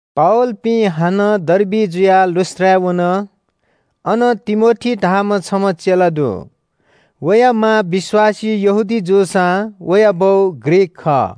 पावलपिं हानं डर्बी जुयाः लुस्‍त्राय् वन। अन तिमोथी धाःम्‍ह छम्‍ह चेला दु। वया मां विश्‍वासी यहूदी जूसां वया बौ ग्रीक खः।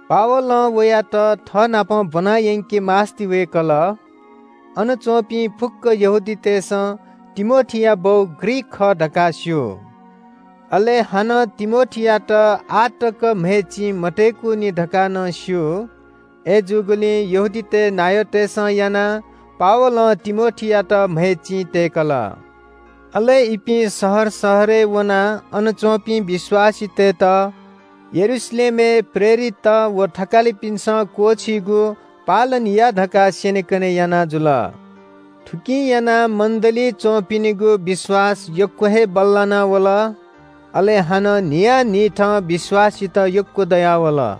पावलं वयात थःनाप ब्‍वनायंके मास्‍ति वय्‌कल। अन च्‍वंपिं फुक्‍क यहूदीतय्‌सं तिमोथीया बौ ग्रीक खः धकाः स्‍यू, अले हानं तिमोथीयात आः तक म्‍हय् चिं मतय्‌कुनि धकाः नं स्‍यू। अय्‌जूगुलिं यहूदीतय् नायःतय्‌सं यानाः पावलं तिमोथीयात म्‍हय् चिं तय्‌कल। अले इपिं शहर शहरय् वनाः अन च्‍वंपिं विश्‍वासीतय्‌त यरूशलेमय् प्रेरितत व थकालिपिन्‍सं क्‍वःछीगु पालन या धकाः स्‍यनेकने याना जुल। थुकिं यानाः मण्‍डलीइ च्‍वंपिनिगु विश्‍वास यक्‍व हे बल्‍लाना वल। अले हानं न्‍हियान्‍हिथं विश्‍वासीत यक्‍व दयावल।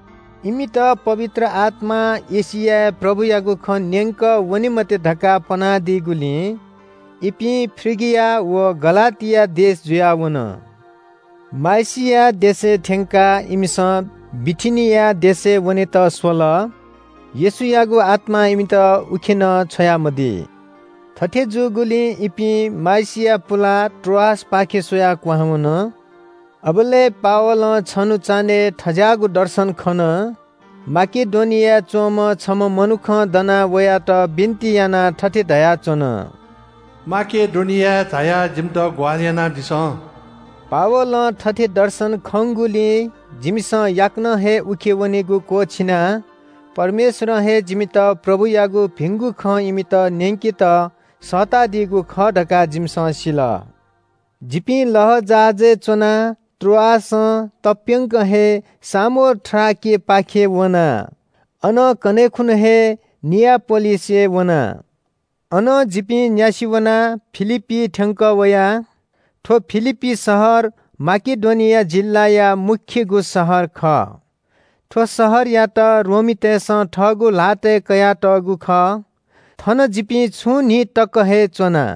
इमित पवित्र आत्‍मां एशियाय् प्रभुयागु खँ न्‍यंक वने मते धकाः पनादीगुलिं इपिं फ्रिगिया व गलातिया देश जुयाः वन। माइसिया देशय् थ्‍यंकाः इमिसं बिथिनिया देशय् वनेत स्‍वल। येशूयागु आत्‍मां इमित उखे नं छ्वयामदी। थथे जूगुलिं इपिं माइसिया पुलाः त्रोआसपाखे स्‍वयाः क्‍वहां वन। अबलय् पावलं छन्‍हु चान्‍हय् थज्‍याःगु दर्शन खन। माकेडोनियाय् च्‍वंम्‍ह छम्‍ह मनुखं दनाः वयात बिन्‍ति यानाः थथे धयाच्‍वन – “माकेडोनियाय् झायाः जिमित ग्‍वाहालि यानादिसँ।” पावलं थथे दर्शन खंगुलिं जिमिसं याकनं हे उखे वनेगु क्‍वःछिना। परमेश्‍वरं हे जिमित प्रभुयागु भिंगु खँ इमित न्‍यंकेत सःतादीगु खः धकाः जिमिसं सिल। जिपिं लःजहाजय् च्‍वनाः त्रोआसं तप्‍यंक हे सामोथ्राकेपाखे वना। अनं कन्‍हय् खुन्‍हु हे नियापोलिसय् वना। अनं जिपिं न्‍यासि वनाः फिलिप्‍पीइ थ्‍यंकः वया। थ्‍व फिलिप्‍पी शहर माकेडोनिया जिल्‍लाया मू शहर खः। थ्‍व शहरयात रोमीतय्‌सं थःगु ल्‍हातय् कयातःगु खः। थन जिपिं छुं न्‍हि तक हे च्‍वना।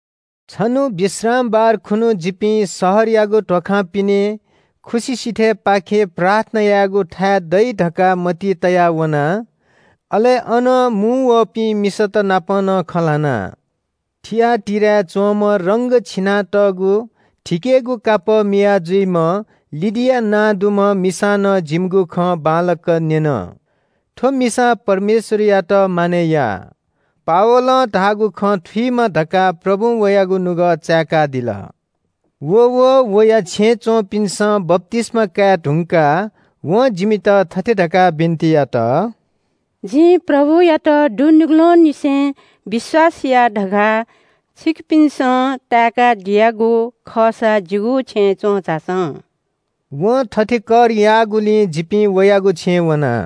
छन्‍हु विश्रामबार खुन्‍हु जिपिं शहरयागु ध्‍वाखां पिने खुसि सिथय् पाखे प्रार्थना यायेगुथाय् दइ धकाः मतिइ तयाः वना। अले अन मुंवःपिं मिसात नाप नं खँ ल्‍हाना। थिआटीराय् च्‍वंम्‍ह रंग छिनातःगु थिकेगु कापः मिया जुइम्‍ह लिडिया नां दुम्‍ह मिसां नं जिमिगु खँ बांलाक न्‍यन। थ्‍व मिसां परमेश्‍वरयात मानय् याः। पावलं धाःगु खँ थुइमा धकाः प्रभुं वयागु नुगः चाय्‌कादिल। अले व वया छेँय् च्‍वंपिन्‍सं बप्‍तिस्‍मा काये धुंकाः वं जिमित थथे धकाः बिन्‍ति यात – “जिं प्रभुयात दुनुगलंनिसें विश्‍वास याः धकाः छिकपिन्‍सं ताय्‌कादियागु खःसा जिगु छेँय् च्‍वं झासँ।” वं थथे कर याःगुलिं जिपिं वयागु छेँय् वना।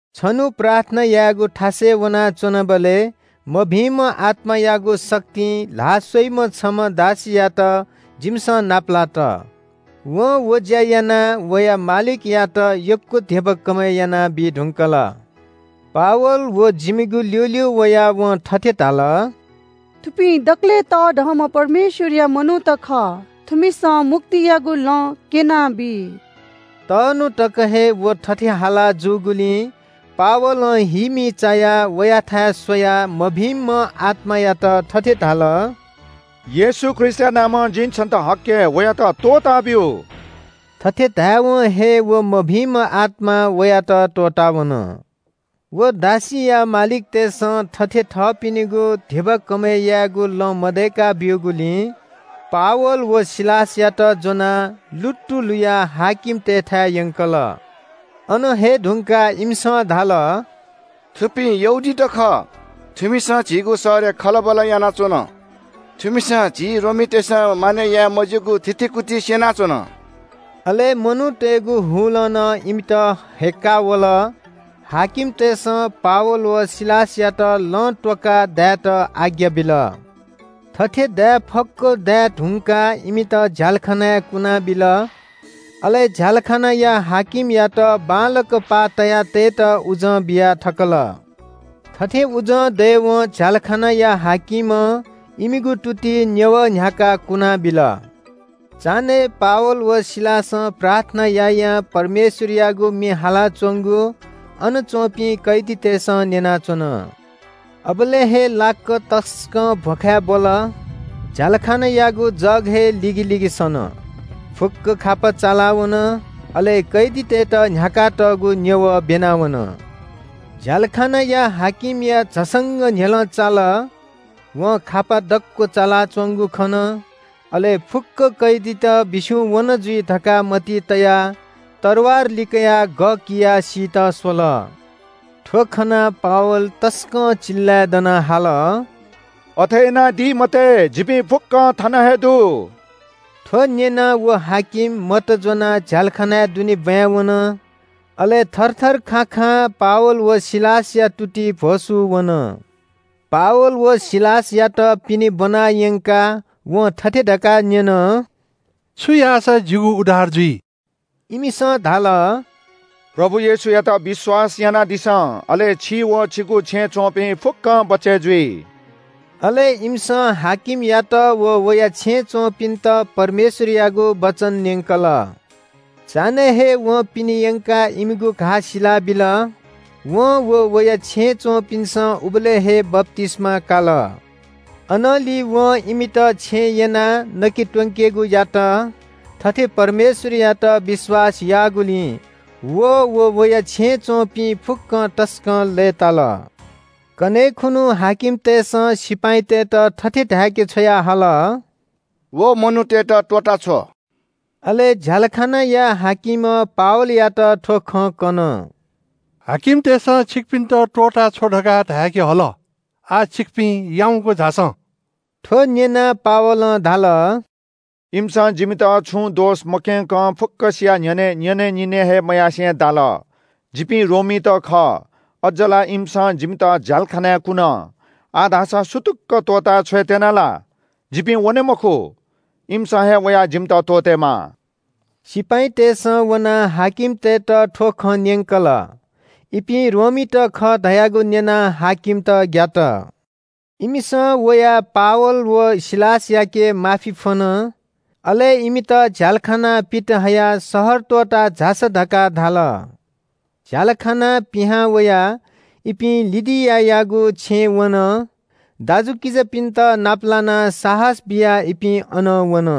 छन्‍हु प्रार्थना यायेगु थासय् वनाच्‍वनाबलय् मभिंम्‍ह आत्‍मायागु शक्तिं ल्‍हाः स्‍वइम्‍ह छम्‍ह दासीयात जिमिसं नापलात। वं व ज्‍या यानाः वया मालिकयात यक्‍व धिबा कमय् यानाबी धुंकल। पावल व जिमिगु ल्‍यूल्‍यू वयाः वं थथे धाल – “थुपिं दकलय् तःधंम्‍ह परमेश्‍वरया मनूत खः। थुमिसं मुक्तियागु लँ क्‍यनाबी।” तःन्‍हु तक हे व थथे हाला जूगुलिं पावलं हीमी चायाः वयाथाय् स्‍वयाः मभिंम्‍ह आत्‍मायात थथे धाल – “येशू ख्रीष्‍टया नामं जिं छन्‍त हक्‍के, वयात त्‍वःताब्‍यु।” थथे धायेवं हे व मभिंम्‍ह आत्‍मां वयात त्‍वःतावन। व दासीया मालिकतय्‌सं थथे थःपिनिगु धिबा कमय् यायेगु लँ मदय्‌का ब्‍यूगुलिं पावल व सिलासयात ज्‍वनाः लुत्तु लुयाः हाकिमतय्‌थाय् यंकल। अन हये धुंकाः इमिसं धाल – “थुपिं यहूदीत खः। थुमिसं झीगु शहरय् खलबल यानाच्‍वन। थुमिसं झी रोमीतय्‌सं मानय् याये मज्‍यूगु थितिकुति स्‍यनाच्‍वन।” अले मनूतय्‌गु हुलं नं इमित हय्‌क्‍का वल। हाकिमतय्‌सं पावल व सिलासयात लं त्‍वःकाः दायेत आज्ञा बिल। थथे दाये फक्‍व दाये धुंकाः इमित झ्‍यालखानाय् कुनाबिल। अले झ्‍यालखानाया हाकिमयात बांलाक पाः तया तयेत उजं बिया थकल। थथे उजं दयेवं झ्‍यालखानाया हाकिमं इमिगु तुतिइ न्‍यवः न्‍ह्याकाः कुनाबिल। चान्‍हय् पावल व सिलासं प्रार्थना यायां परमेश्‍वरयागु म्‍ये हालाच्‍वंगु अन च्‍वंपिं कैदीतय्‌सं न्‍यनाच्‍वन। अबलय् हे लाक्‍क तसकं भ्‍वखाय् ब्‍वल। झ्‍यालखानायागु जग हे लिगिलिगि सन। फुक्‍क खापा चालावन, अले कैदीतय्‌त न्‍ह्याकातःगु न्‍यवः ब्‍यना वन। झ्‍यालखानाया हाकिमया झसंक न्‍ह्यलं चाल। वं खापा दक्‍व चालाच्‍वंगु खन। अले “फुक्‍क कैदीत बिस्‍युं वन जुइ” धकाः मतिइ तयाः तरवार लिकयाः गः कियाः सीत स्‍वल। थ्‍व खनाः पावल तसकं चिल्‍लाय् दनाः हाल – “अथे यानादी मते, जिपिं फुक्‍कं थन हे दु।” थ्‍व न्‍यनाः व हाकिम मत ज्‍वनाः झ्‍यालखानाय् दुने ब्‍वाँय् वन। अले थरथर खाखां पावल व सिलासया तुतिइ भ्‍वसू वन। पावल व सिलासयात पिने ब्‍वना यंकाः वं थथे धकाः न्‍यन – “छु याःसा जिगु उद्धार जुइ?” इमिसं धाल – “प्रभु येशूयात विश्‍वास यानादिसँ, अले छि व छिगु छेँय् च्‍वंपिं फुक्‍कं बचय् जुइ।” अले इमिसं हाकिमयात व वया छेँय् च्‍वंपिन्‍त परमेश्‍वरयागु वचन न्‍यंकल। चान्‍हय् हे वं पिने यंकाः इमिगु घाः सिला बिल। वं व वया छेँय् च्‍वंपिन्‍सं उबलय् हे बप्‍तिस्‍मा काल। अनंलि वं इमित छेँय् यनाः नके त्‍वंकेगु यात। थथे परमेश्‍वरयात विश्‍वास याःगुलिं व अले वया छेँय् च्‍वंपिं फुक्‍कं तसकं लय्‌ताल। कन्‍हय् खुन्‍हु हाकिमतय्‌सं सिपाइँतय्‌त थथे धाय्‌के छ्वयाहल – “व मनूतय्‌त त्‍वःताछ्व।” अले झ्‍यालखानाया हाकिमं पावलयात थ्‍व खँ कन – “हाकिमतय्‌सं छिकपिन्‍त त्‍वःताछ्व धकाः धाय्‌के हल। आः छिकपिं याउँक झासँ।” थ्‍व न्‍यनाः पावलं धाल – “इमिसं जिमित छुं दोष मक्‍यंकं फुक्‍कसिया न्‍ह्यःने न्‍यनेनिने हे मयासें दाल। जिपिं रोमीत खः। अज्‍ज ला इमिसं जिमित झ्‍यालखानाय् कुन। आः धाःसा सुतुक्‍क त्‍वःता छ्वयेत्‍यन ला? जिपिं वने मखु। इमिसं हे वयाः जिमित त्‍वःतेमाः।” सिपाइँतय्‌सं वनाः हाकिमतय्‌त थ्‍व खँ न्‍यंकल। इपिं रोमीत खः धयागु न्‍यनाः हाकिमत ग्‍यात। इमिसं वयाः पावल व सिलासयाके माफी फ्‍वन। अले इमित झ्‍यालखानां पित हयाः शहर त्‍वःता झासँ धकाः धाल। झ्‍यालखानां पिहां वयाः इपिं लिडियायागु छेँय् वन। दाजुकिजापिन्‍त नाप लानाः साहस बियाः इपिं अनं वन।